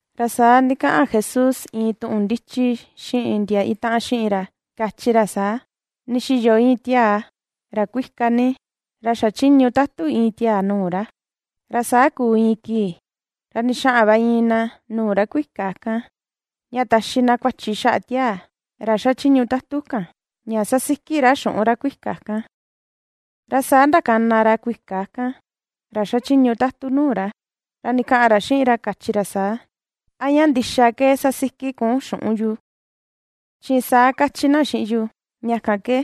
Ra saa ndikaꞌan Jesús iin tuꞌun ndichi xiꞌin ndia itaꞌan xiꞌin ra kachi ra saa: ―Ndixiyo iin tiaa ra kuika ni, ra xachiñu tatu iin tiaa nuu ra, ra saa kuu iin kii ra ndixaꞌan va iin na nuu ra kuika kan, ña taxi na kuachi xaꞌa tiaa ra xachiñu tatu kan ña sasiki ra xuꞌun ra kuika kan. Ra saa ndakana ra kuika kan, ra xachiñu tatu nuu ra, ra ndikaꞌan ra xiꞌin ra kachi ra saa: “¿A ña ndixa ke sasiki kun xuꞌun yu?, chi saa kachi na xiꞌin yu. Ña kan ke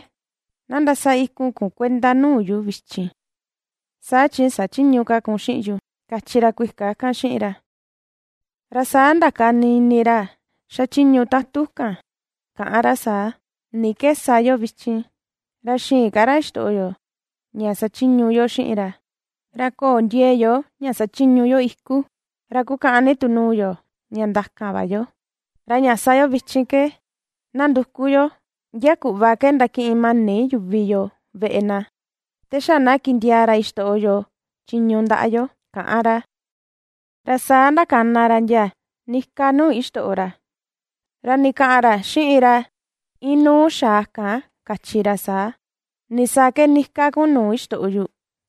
na ndasa ikun kun kuenda nuu yu vichin, saa chi sachïñu ka kun xiꞌin yu”, kachi ra kuika kan xiꞌin ra. Ra saa ndakani ini ra xachiñu tatu kan kaꞌan ra saa: “¿Ni ke sa yo vichin ra xïin ka ra xitoꞌo yo ña sachiñu yo xiꞌin ra? Ra köo ndiee yo ña sachiñu yo iku, ra kukaꞌan ni tu nuu yo ña ndakan va yo. Ra ña sa yo vichin ke, na nduku yo ndia kuꞌva ke ndakiꞌin mani yuvi yoo veꞌe na, te xa na kindiaa ra ixtoꞌo yo chiñu ndaꞌa yo”, kaꞌan ra. Ra saa ndakana ra ndia nika nuu ixtoꞌo ra, ra ndikaꞌan ra xiꞌin ra inuu xaa kan kachi ra saa: “¿Nisaa ke nika kun nuu ixtoꞌo yu?”,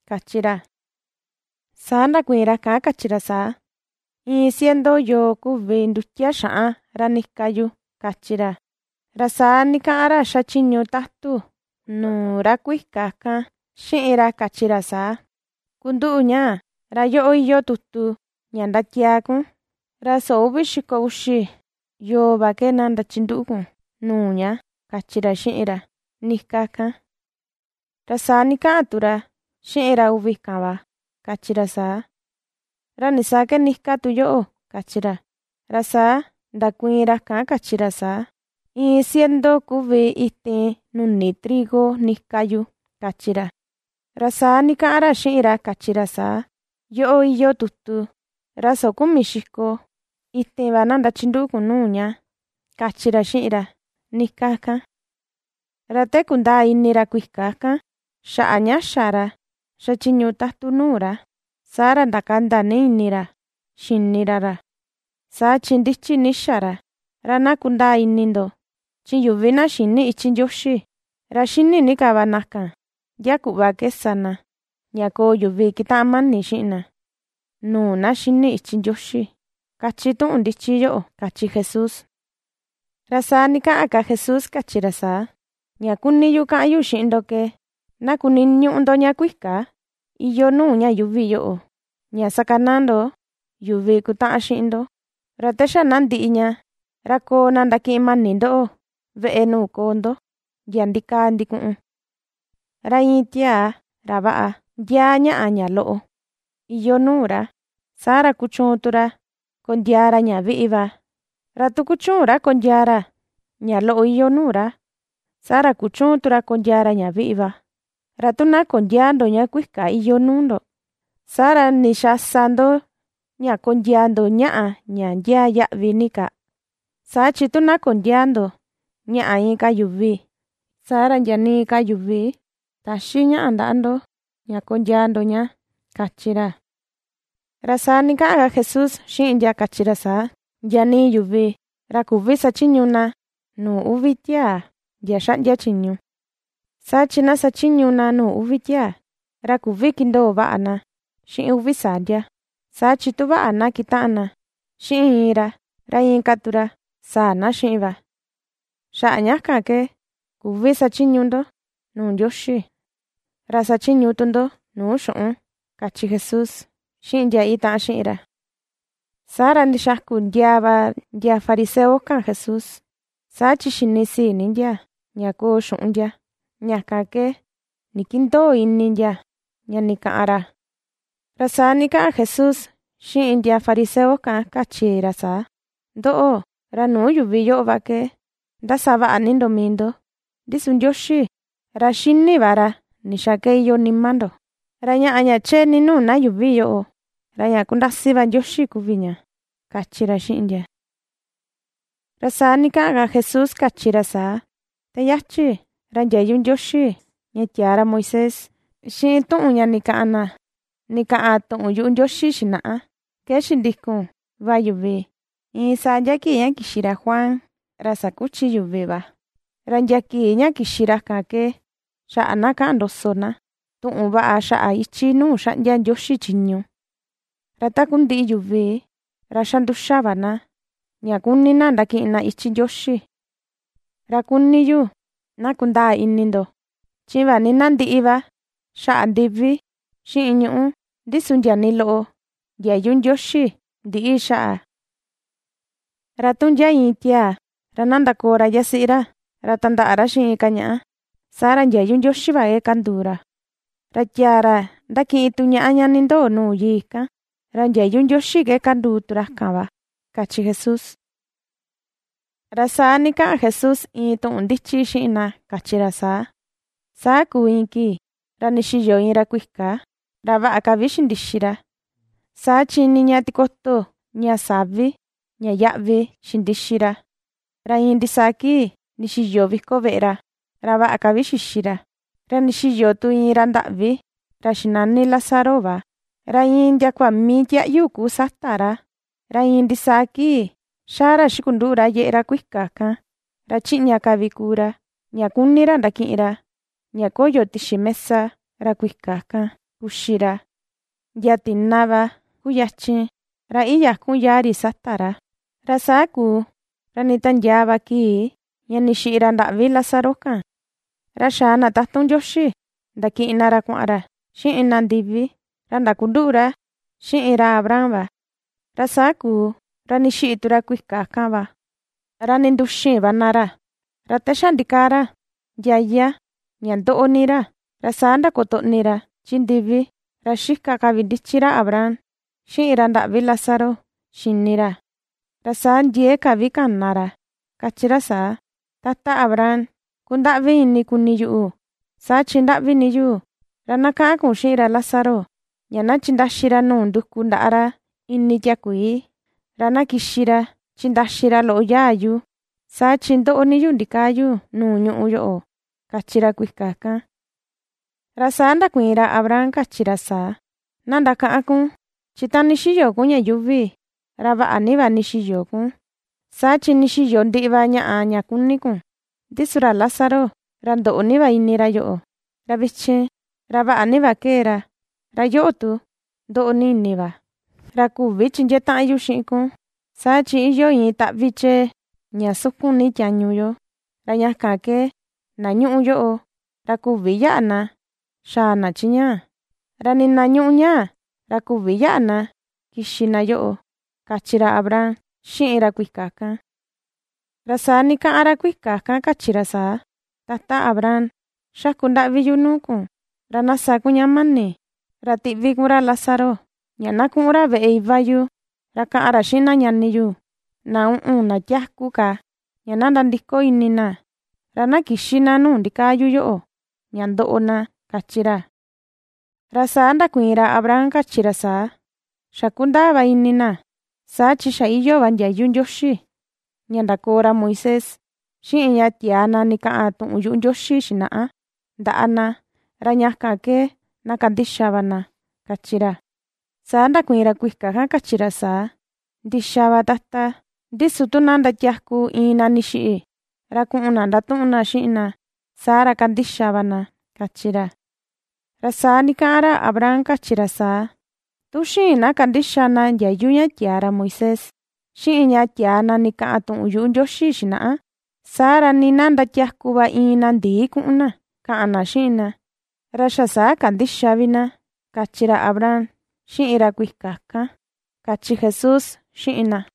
kachi ra. Saa ndakuiin ra kan kachi ra saa: “Iin ciento yoo kuvi ndutia xaꞌan ra nika yu”, kachi ra. Ra saa ndikaꞌan ra xachiñu tatu nuu ra kuika kan xiꞌin ra kachi ra saa: “Kunduꞌu ñaa, ra yoꞌo iyoo tutu ña ndatiaa kun, ra soo uvi xiko uxi yoo va ke ndachinduꞌu kun nuu ña”, kachi ra xiꞌin ra nika kan. Ra saa ndikaꞌan tu ra xiꞌin ra uvi kan va, kachi ra saa: “¿Ra nisaa ke nika tu yoꞌo?”, kachi ra. Ra saa ndakuiin ra kan kachi ra saa: “Iin ciento kuvi itin nuni trigo nika yu”, kachi ra. Ra saa ndikaꞌan ra xiꞌin ra kachi ra saa: “Yoꞌo iyoo tutu, ra soo kumi xiko, itin va na ndachinduꞌu kun nuu ña”, kachi ra xiꞌin ra nika kan. Ra te kundaa ini ra kuika kan xaꞌa ña xa ra xachiñu tatu nuu ra, saa ra ndakanda ni ini ra xini ra ra, saa chi ndichi ni xa ra. Ra na kundaa ini ndo chi yuvi na xïni ichi Ndioxi, ra xini ni ka va na kan ndia kuꞌva ke sa na ña koo yuvi kitaꞌan mani xiꞌin na, nuu na xini ichi Ndioxi, kachi tuꞌun ndichi yoꞌo ―kachi Jesús. Ra saa ndikaꞌan ka Jesús kachi ra saa: ―Ña kuni yu kaꞌan yu xiꞌin ndo ke na kuniñuꞌu ndo ña kuika iyoo nuu ña yuuvi yoꞌo, ña sakanaa ndo yuvi kutaꞌan xiꞌin ndo, ra te xa na ndiꞌi ña, ra koo na ndakiꞌin mani ndoꞌo veꞌe nuu koo ndo ndia ndikaa ndikuꞌun. ’Ra iin tiaa ra vaꞌa ndiaa ñaꞌa ña loꞌo iyoo nuu ra, saa ra kuchuun tu ra kondiaa ra ña viꞌi va; ra tu kuchüun ra kondiaa ra ña loꞌo iyoo nuu ra, saa ra kuchüun tu ra kondiaa ra ña viꞌi va. Ra tu na kondiäa ndo ña kuika iyoo nuu ndo, ¿saa ra ndixaa sa ndo ña kondiaa ndo ñaꞌa ña ndiaa yaꞌvi ni ka? Saa chi tu na kondiäa ndo ñaꞌa inka yuvi, saa ra, ndia nii ka yuvi täxi ñaꞌa ndaꞌa ndo ña kondiaa ndo ña? ―kachi ra. Ra saa ndikaꞌan ka Jesús xiꞌin ndia kachi ra saa: ―Ndia nii yuvi ra küvi sachiñu na nuu uvi tiaa ndia xaꞌndia chiñu, saa chi na xachiñu nuu uvi tiaa, ra küvi kindoo vaꞌa na xiꞌin uvi saa ndia. Saa chi tu vaꞌa na kitaꞌan na xiꞌin iin ra, ra inka tu ra saa na xiꞌin va. Xaꞌa ña kan ke küvi sachiñu ndo nuu Ndioxi ra sachiñu tu ndo nuu xuꞌun ―kachi Jesús xiꞌin ndia itaꞌan xiꞌin ra. Saa ra ndixaku ndiaa va ndia fariseo kan Jesús, saa chi xinisii ni ndia ña koo xuꞌun ndia. Ña kan ke ndikindöo ini ndia ña ndikaꞌan ra. Ra saa ndikaꞌan Jesús xiꞌin ndia fariseo kan kachi ra saa: ―Ndoꞌo, ra nuu yuvi yoꞌo va ke ndasa vaꞌa ni ndo mii ndo, ndi su Ndioxi, ra xini va ra ndixaa ke iyoo nima ndo. Ra ñaꞌa ña chee ni nuu na yuuvi yoꞌo, ra ña kundasi va Ndioxi kuvi ña ―kachi ra xiꞌin ndia. Ra saa ndikaꞌan ka Jesús kachi ra saa: ―Te yachi ra ndiayu Ndioxi ña tiaa ra Moisés, xiꞌin tuꞌun ña ndikaꞌan na ndikaꞌan tuꞌun yuꞌu Ndioxi xinaꞌa, ke xindikun va yuvi iin saa ndia kii ña kixi ra Juan, ra sakuchi yuvi va, ra ndia kii ña kixi ra kan ke xaꞌa na kaꞌan ndoso na tuꞌun vaꞌa xaꞌa ichi nuu xaꞌndia Ndioxi chiñu. Ra takundiꞌi yuvi ra xa nduxa va na ña kuni na ndakiꞌin na ichi Ndioxi. ’Ra kuni yu na kundaa ini ndo, chi vaꞌa ni na ndiꞌi va xaꞌa ndivi xiꞌin ñuꞌu, ndi su ndia nii loꞌo ndiayu Ndioxi ndïꞌi xaꞌa. ’Ra tu ndia iin tiaa, ra na ndakoo ra yasiꞌi ra, ra tandaꞌa ra xiꞌin inka ñaꞌa, saa ra ndiayu Ndioxi va ke kanduu ra. Ra tiaa ra ndakiꞌin tu ñaꞌa ña nindoo nuu yii kan, ra ndiayu Ndioxi ke kanduu tu ra kan va ―kachi Jesús. Ra saa ndikaꞌan Jesús iin tuꞌun ndichi xiꞌin na kachi ra saa: ―Saa kuu iin kii ra ndixiyo iin ra kuika. Ra vaꞌa ka vi xindixi ra saa chi niña tikoto ña savi ña yaꞌvi xindixi ra, ra iin ndisaa kii ndixiyo viko veꞌe ra, ra vaꞌa ka vi xixi ra. Ra ndixiyo tu iin ra ndaꞌvi, ra xinani Lázaro va. Ra iin ndiakua mii tiaꞌyu kuu sata ra. Ra iin ndisaa kii xaa ra xikunduꞌu ra yeꞌe ra kuika kan. Ra chiꞌña ka vi kuu ra, ña kuni ndakiꞌin ra ña koyo tixi mesa ra kuika kan kuxi ra; ndia tina va kuyachin ra iyakun yaa ri sata ra. Ra saa kuu ra nditiandiaa va kii ña ndixiꞌi ra ndaꞌvi Lázaro kan. Ra xaa na tatun Ndioxi ndakiꞌin na ra kuaꞌan ra xiꞌin na ndivi, ra ndakunduꞌu ra xiꞌin ra Abraham va. Ra saa kuu ra ndixiꞌi tu ra kuika kan va, ra ndinduxin va na ra. Ra te xa ndikaa ra ndiaya ña ndoꞌo ni ra. Ra saa ndakotoꞌni ra chi ndivi, ra xika ka vi ndichi ra Abraham xiꞌin ra ndaꞌvi Lázaro xini ra. Ra saa ndiee ka vi kana ra kachi ra saa: “¡Tata Abraham, kundaꞌvi ini kuni yuꞌu saa chi ndaꞌvi ni yu! Ra na kaꞌan kun xiꞌin ra Lázaro ña na chindaxi ra nuu nduku ndaꞌa ra ini tiakuii, ra na kixi ra chindaxi ra loꞌo yaa yu. Saa chi ndoꞌo ni yu ndikaa yu nuu ñuꞌu yoꞌo”, kachi ra kuika kan. Ra saa ndakuiin ra Abraham kachi ra saa: “Na ndakaꞌan kun, chi ta ndixiyo kun ña yuuvi, ra vaꞌa ni va ndixiyo kun, saa chi ndixiyo ndiꞌi va ñaꞌa ña kuni kun. Ndi su ra Lázaro, ra ndoꞌo ni va ini ra yoꞌo. Ra vichin ra vaꞌa ni va kee ra, ra yoꞌo tu ndoꞌo ni ini va. Ra küvi chindiee taꞌan yu xiꞌin kun, saa chi iyoo iin taꞌvi chee ña sukun ni tiañu yo, ra ña kan ke na ñuꞌu yoꞌo ra küvi yaꞌa na xaa na chi ñaa, ra nii na ñuꞌu ñaa ra küvi yaꞌa na kixi na yoꞌo”, kachi ra Abraham xiꞌin ra kuika kan. Ra saa ndikaꞌan ra kuika kan kachi ra saa: “Tata Abraham, xaku ndaꞌvi yu nuu kun, ra na sa kun ña mani ra tiꞌvi kun ra Lázaro ña na kuꞌun ra veꞌe iva yu. Ra kaꞌan ra xiꞌin na ñani yu na uꞌun na tiaku ka ña na nandiko ini na, ra na kïxi na nuu ndikaa yu yoꞌo ña ndoꞌo na”, kachi ra. Ra saa ndakuiin ra Abraham kachi ra saa: “Xa kundaa va ini na saa chi xa iyoo va ndiayu Ndioxi ña ndakoo ra Moisés, xiꞌin ña tiaa na ndikaꞌan tuꞌun yuꞌu Ndioxi xinaꞌa ndaꞌa na. ¡Ra ña kan ke na kandixa va na!”, kachi ra. Saa ndakuiin ra kuika kan kachi ra saa: “Ndixa va Tata, ndi su tu na ndatiaku iin na ndixiꞌi ra kuꞌun na ndatuꞌun na xiꞌin na, saa ra kandixa va na”, kachi ra. Ra saa ndikaꞌan ra Abraham kachi ra saa: “Tu xïin na kandixa na ndiayu ña tiaa ra Moisés, xiꞌin ña tiaa na ndikaꞌan tuꞌun yuꞌu Ndioxi xinaꞌa, saa ra nii na ndatiaku va iin na ndii kuꞌun na kaꞌan na xiꞌin na; ra xa saa kandïxa vi na”, kachi ra Abraham xiꞌin ra kuika kan ―kachi Jesús xiꞌin na.